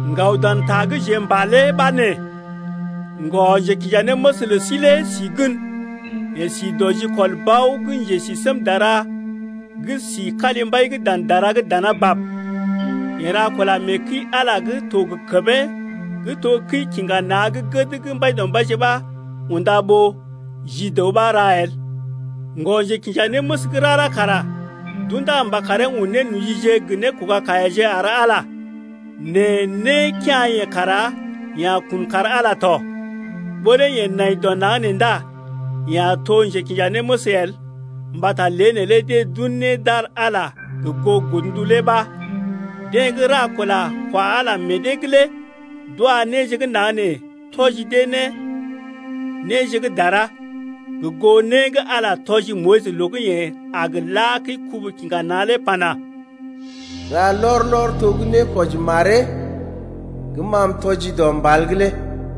Ŋgaw dan ta gə́ jeḛ m’pa lé ɓa nee: Ŋgɔ-njekinjanéməs lə sí lé si gən, yeḛ si dɔ jikɔl Bao gə́ njesisémdara gə́ si kalimbai’g dan dara’g dana bab. Yeḛ ra kula mee kəi-Ala gə́ to gə kəmee gə́ to kəi-kiŋga-na̰ gə́ gəd gə́ Mbaidɔmbaije ɓa unda ɓó ji dəw ɓa ra el. Ŋgɔ-njekinjanéməs gə́ rara kara d’undá mba karee un nénojije gə nékoga-kaiyaje ar Ala, nɛ né kea̰-yeḛ kara yeḛ a kun kar Ala ya tɔ. Ɓó lé yeḛ nai dɔ naŋg nee ndá yeḛ a to njekinjanéməs el mbata lé neelé deḛ d’un né d’ar Ala gə goo godndu lé ɓa. Deḛ gə́ ra kula kwa Ala meḛ dee’g lé d’wa néje gə́ naŋg nee tɔji dee ne néje gə́ dara, gə goo né gə́ Ala tɔji Moyis loo gə́ yeḛ a gə la kəi-kubu-kiŋga-na̰ lé pana: Ra lɔr-lɔr to gə́ nékwɔji maree gə́ ma m’tɔjii dɔ mbal’g lé.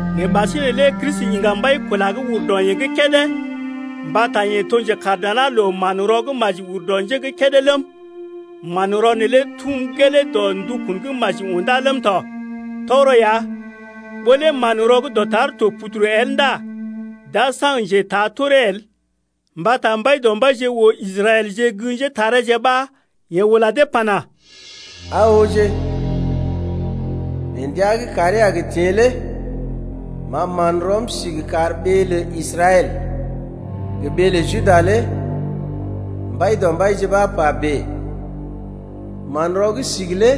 Nɛ ɓasinè lé Kristi iŋga mbai-kula gə́ ur dɔ yeḛ gə́ kédé mbata yeḛ to njekaar dana loo manrɔ gə́ maji ur dɔ nje gə́ kédé ləm, manrɔ neelé tum gelee dɔ ndukun gə́ maji undá ləm tɔ. Tɔgərɔ ya, ɓó lé manrɔ gə́ dɔtar to puduru el ndá d’a saŋg njetaa toree el. Mbata Mbaidɔmbaije oo Israɛlje gə́ njétareeje ɓa yeḛ ula dee pana: Aa ooje, mee ndəa gə́ kàree a gə teḛ lé M’a man rɔm sigi kar ɓee lə Israɛl gə ɓee lə Juda lé Mbaidɔmbaije ɓa pa bèe. Manrɔ gə́ sigi lé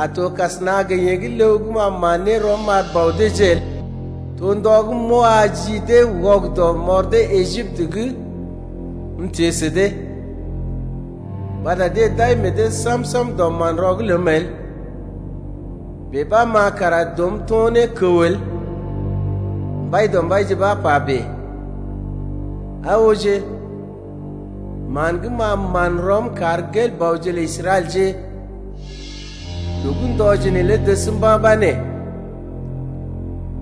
a to kasəna gə yeḛ gə́ ləw gə́ ma man ne rɔm m’ar bɔ deeje el. To ndɔ gə́ m’wa ji dee wɔgədɔ m’ɔr dee Ejiptə’g m’teḛ sə dee Mbata deḛ d’ai meḛ dee sam-sam dɔ manrɔ’g ləm el, Bèe ɓa ma kara dɔm to̰ ne kəw el. Mbaidɔmbaije ɓa pa bèe. Aa ooje, man gə́ m’a man rɔm kar gel-bɔje lə Israɛlje Loo gə́ ndɔje neelé dəs mba̰ ɓa nee: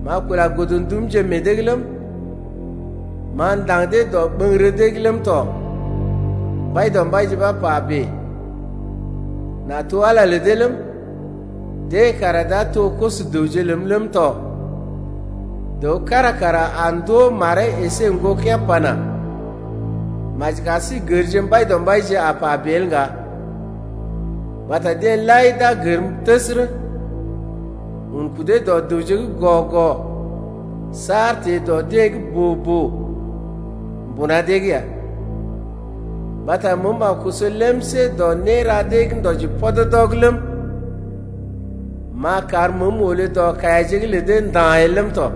M’a kula godndumje meḛ dee’g ləm, M’a ndaŋg dee dɔɓəŋgərə dee’g ləm tɔ. Mbaidɔmbaije ɓa pa bèe. N’a to Ala lə dee ləm, Deḛ kara d’a to koso-dəwje neḛ ləm tɔ. Dəw kára kara a ndoo maree əsé ŋgokea̰ pana: Maji kar sí gərje Mbaidɔmbaije, a pa bèe el ŋga, Mbata deḛ lai d’a gərm təsərə, Un kudee dɔ dəwje gə́ gɔ-gɔ saar teḛ ne dɔ deḛ gə́ boo-boo mbuna dee’g ya. Mbata məəm a koso lemsé dɔ néra dee gə́ ndɔji pɔdɔdɔ’g ləm, M’a kar məəm olé dɔ kaiyaje’g lə dee nda̰ el ləm tɔ.